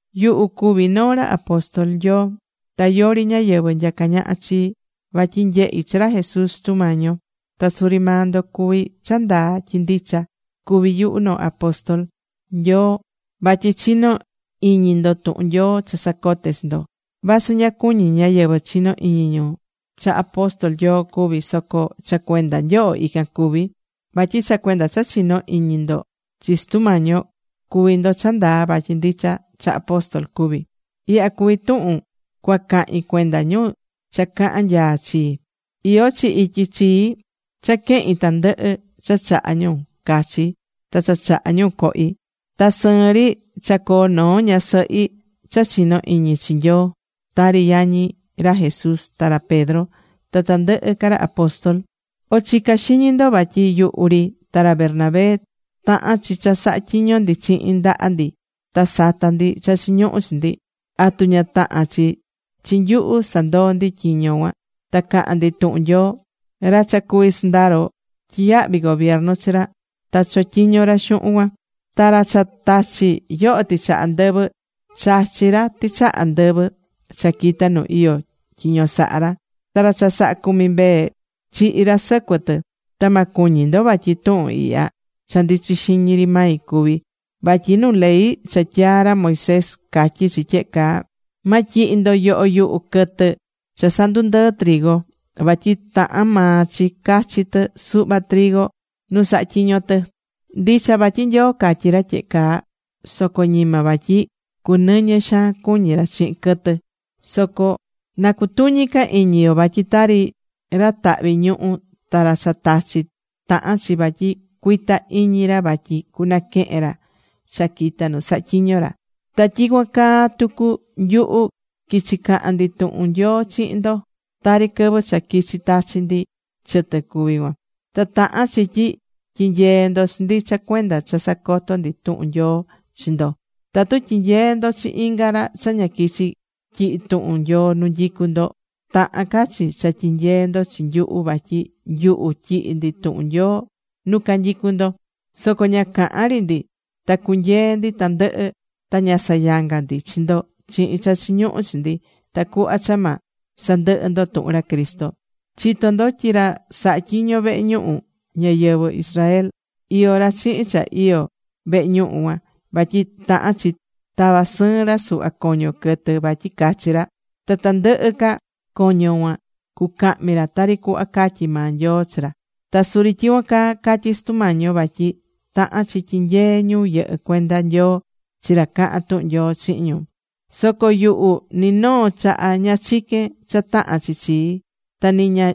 Yuhu cuví noo ra apóstol Nyoo. Ta yori ñáyɨvɨ nyacá ñaha chii. Vatyi nyehi̱ chi ra Jesús Sutu Mañi yo. Ta suri maa ndo cuví cha ndaa tyi ndicha cuví yuhu noo apóstol Nyoo, vatyi chinó iñi ndo tuhun Nyoo cha sacote̱ chi ndo. Vasɨ ña cuñí ñáyɨvɨ chinó iñi ñu cha apóstol Nyoo cuví, soco cha cuenda nyoho ican cuví. Vatyi cha cuenda cha chinó iñi ndo chi Sutu Mañi yo, cuví ndo cha ndaa vatyi ndicha cha apóstol cuví. Ihya cuví tuhun cuacahin cuenda ñu cha cahán nyaa chii. Iyó chi ityi chii cha quehín tandɨhɨ cha chahá ñu cachi ta cha chahá ñu cohi. Ta sɨɨn ri cha coo noo ñasɨhi cha chinó iñi chi Nyoo, tari yañi ra Jesús, ta ra Pedro ta tandɨhɨ ca ra apóstol. O chicá xiñi ndo vatyi yuhu ri ta ra Bernabé tahán chi saha tyiño ndi chihin ndaha ndi ta sata ndi cha chiñuhú chi ndi. ¿Atu ña tahán chi chi nyuhu sandoo ndi tyiño cuan ta cahan ndi tuhun Nyoo? Ra cha cuví sɨndaro tyiyahví gobiernu chi ra ta chotyiño ra xuhun cuan. Ta ra cha tachí yoho tichaha ndɨvɨ, chachí ra tichaha ndɨvɨ cha quita nu iyó tyiño saha ra. Ta ra cha sahá cumi mbee chihí ra sɨcuɨ tɨ. Ta ma cuñi ndo vatyi tuhun ihya cha ndichi xiñi ri mai cuví. Vatyi nu ley cha tyaa̱ ra Moisés catyí chi tyehe caa: “Ma tyihi ndo yoho yuhu quɨtɨ cha sandundɨɨ́ trigo, vatyi tahán maa chi cachi tɨ suhva nu sahá tyiño tɨ.” Ndicha vatyi Nyoo catyí ra tyehe caa soco ñima vatyi cunɨñɨ xaan cuñi ra chihin quɨtɨ. Soco na cutuñi ca iñi yo vatyi tari ra tahví ñuhu ta ra cha tachí, tahán chi vatyi cuita iñi ra vatyi cunaquehen ra cha quita nu saha tyiño ra. Ta tyicuan caa, tatu nyuhu quichi cahan ndi tuhun Nyoo chihin ndo, tari quɨvɨ cha quichi tachí ndi chɨtɨ cuvi cuan. Ta tahán chi tyi tyinyeé ndo chi ndi cha cuenda cha sacotó ndi tuhun Nyoo chi ndo. Tatu tyinyeé ndo chi inga ra cha ña quichi̱ tyihi tuhun Nyoo nu nyicú ndo, tahán ca chi cha tyinyee ndo chi nyuhu, vatyi nyuhu tyihi̱ ndi tuhun Nyoo nu canyicú ndo. Soco ña cahán ri ndi, ta cunyeé ndi tandɨhɨ. Ta ña sayangá ndi chi ndo chihin cha chiñuhú chi ndi. Tacuhva cha ma sandɨhɨ ndo tuhun ra Cristo. Chitó ndo tyi ra sahá tyiño vehe ñuhu ñáyɨvɨ Israel, iyó ra chihin cha iyó vehe ñuhu cuan. Vatyi tahán chi tavá sɨɨn ra suhva coño quɨtɨ vatyi cachi ra. Ta tandɨhɨ ca coño cuan cucahmi ra tari cuhva catyí maa Nyoo chi ra. Ta suri tyicuan caa catyí Sutu Mañi yo, vatyi tahán chi tyinyeé ñu yɨhɨ́ cuenda Nyoo chi ra cahán tuhun Nyoo chihin ñu. Soco yuhu ni noo chaha ña chique̱n cha tahán chi chii. Ta ni ña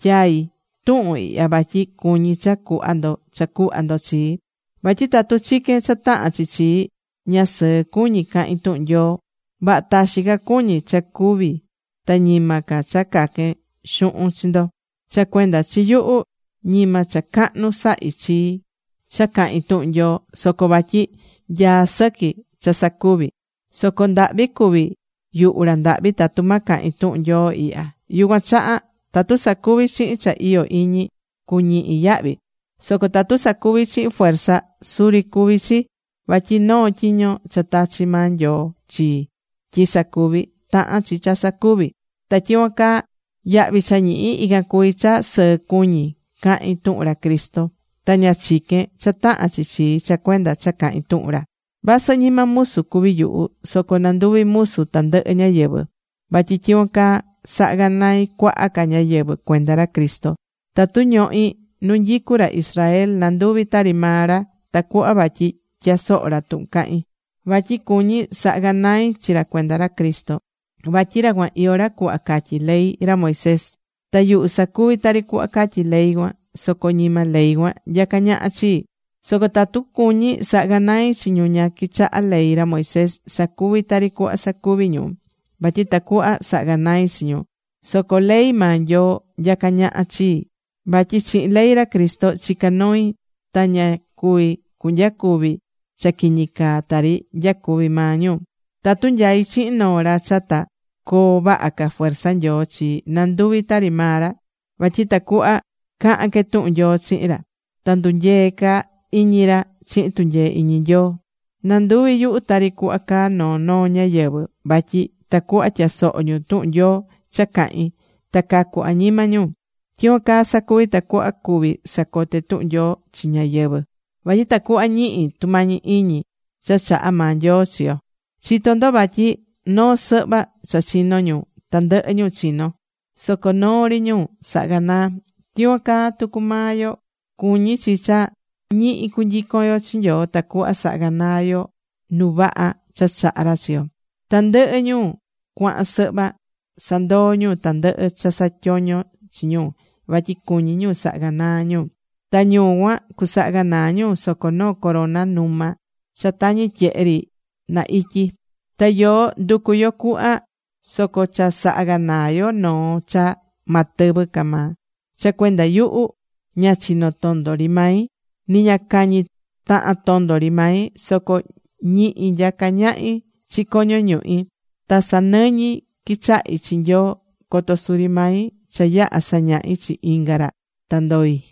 tyaí tuhun ihya vatyi cuñí cha cuhva ndo cha cuhva ndo chii. Vatyi tatu chiquén cha tahán chi chii, ña sɨɨ cuñí cahín tuhun Nyoo. Vaha taxin ca cuñí cha cúvi ta ñima ca cha caquen xuhun chi ndo. Cha cuenda chi yuhu ñima cha cahnu sahí chii cha cahín tuhun Nyoo. Soco vatyi nyaá sɨqui cha sacuví. Soco ndahvi cuví yuhu ra ndahvi tatu ma cahin tuhun Nyoo ihya. Yucuan chaha tatu sacuví chihin cha iyó iñi, cuñihi yahvi. Soco tatu sacuví chihin fuerza, suri cuví chi, vatyi noo tyiño cha tachi̱ maa Nyoo chii tyi sacuví, tahán chi cha sacuví. Ta tyicuan caa, yahvi cha ñihi, ican cuví cha sɨɨ cuñí cahín tuhun ra Cristo. Ta ña chiquén cha tahán chi chii cha cuenda cha cahín tuhun ra. Vasɨ ñima musu cuví yuhu. Soco nanduvi̱ musu tandɨhɨ ñáyɨvɨ. Vatyi tyicuan caa saha ganaí cuaha ca ñáyɨvɨ cuenda ra Cristo. Tatu ñohí nu nyicú ra Israel, nanduví tari maa ra tacuhva vatyi tyasoho ra tuhun cahin. Vatyi cuñi saha ganai chi ra cuenda ra Cristo. Vatyi ra cuan iyó ra cuhva catyí ley ra Moisés. Ta yuhu sacuví tari cuhva catyí ley cuan. Soco ñima ley cuan nyacá ñaha chii. Soco tatu cuñí saha ganai chi ñu ña quichahá ley ra Moisés, sacuví tari cuhva sacuví ñu. Vatyi tacuhva saha ganai chi ñu. Soco ley maa Nyoo nyacá ñaha chii vatyi chihin ley ra Cristo chicá noi ta ña cuví cunyacuvi cha quiñi caa tari nyacuví maa ñu. Tatu nyaí chihin noo ra cha ta coo vaha ca fuerza Nyoo chii, nanduví tari maa ra, vatyi tacuhva cahan que tuhun Nyoo chihin ra. Ta ndunyeé ca iñi ra chihin tunyee iñi Nyoo. Nanduví yuhu tari cuhva caa noo noo ñáyɨvɨ, vatyi tacuhva tyasoho ñu tuhun Nyoo cha cahín ta cacú añima ñu. Tyicuan caa sacuví tacuhva cuví sacoté tuhun Nyoo chi ñáyɨvɨ. Vatyi tacuhva ñihi tumañi iñi cha chahá maa Nyoo chi yo. Chitó ndo vatyi noo sɨhva cha chinó ñu, tandɨhɨ ñu chinó, soco noo ri ñu sahá ganaa. Tyicuan caa tucu maa yo, cuñí chi cha ñihi cunyicon yo chi Nyoo tacuhva sahá ganaa yo nu vaha cha chahá ra chi yo. Tandɨhɨ ñu cuahan sɨhva, sandoo ñu tandɨhɨ cha satyoño chi ñu vatyi cuñí ñu sahá ganaa ñu. Ta ñu cuan, cusaha ganaa ñu, soco noo corona numa cha tañi tyehe ri na ityi. Ta yoó nducú yo cuhva soco cha sahá ganaa yo noo cha ma tɨvɨ ca maa. Cha cuenda yuhu ña chinó tondo ri mai, ni ña cañí tahan tondo ri mai. Soco ñihi nyacá ñahi chi coño ñuhi. Ta sanɨñí quichahí chi Nyoo. Coto suri mai cha yaha sañahi̱ chi inga ra ta ndoí.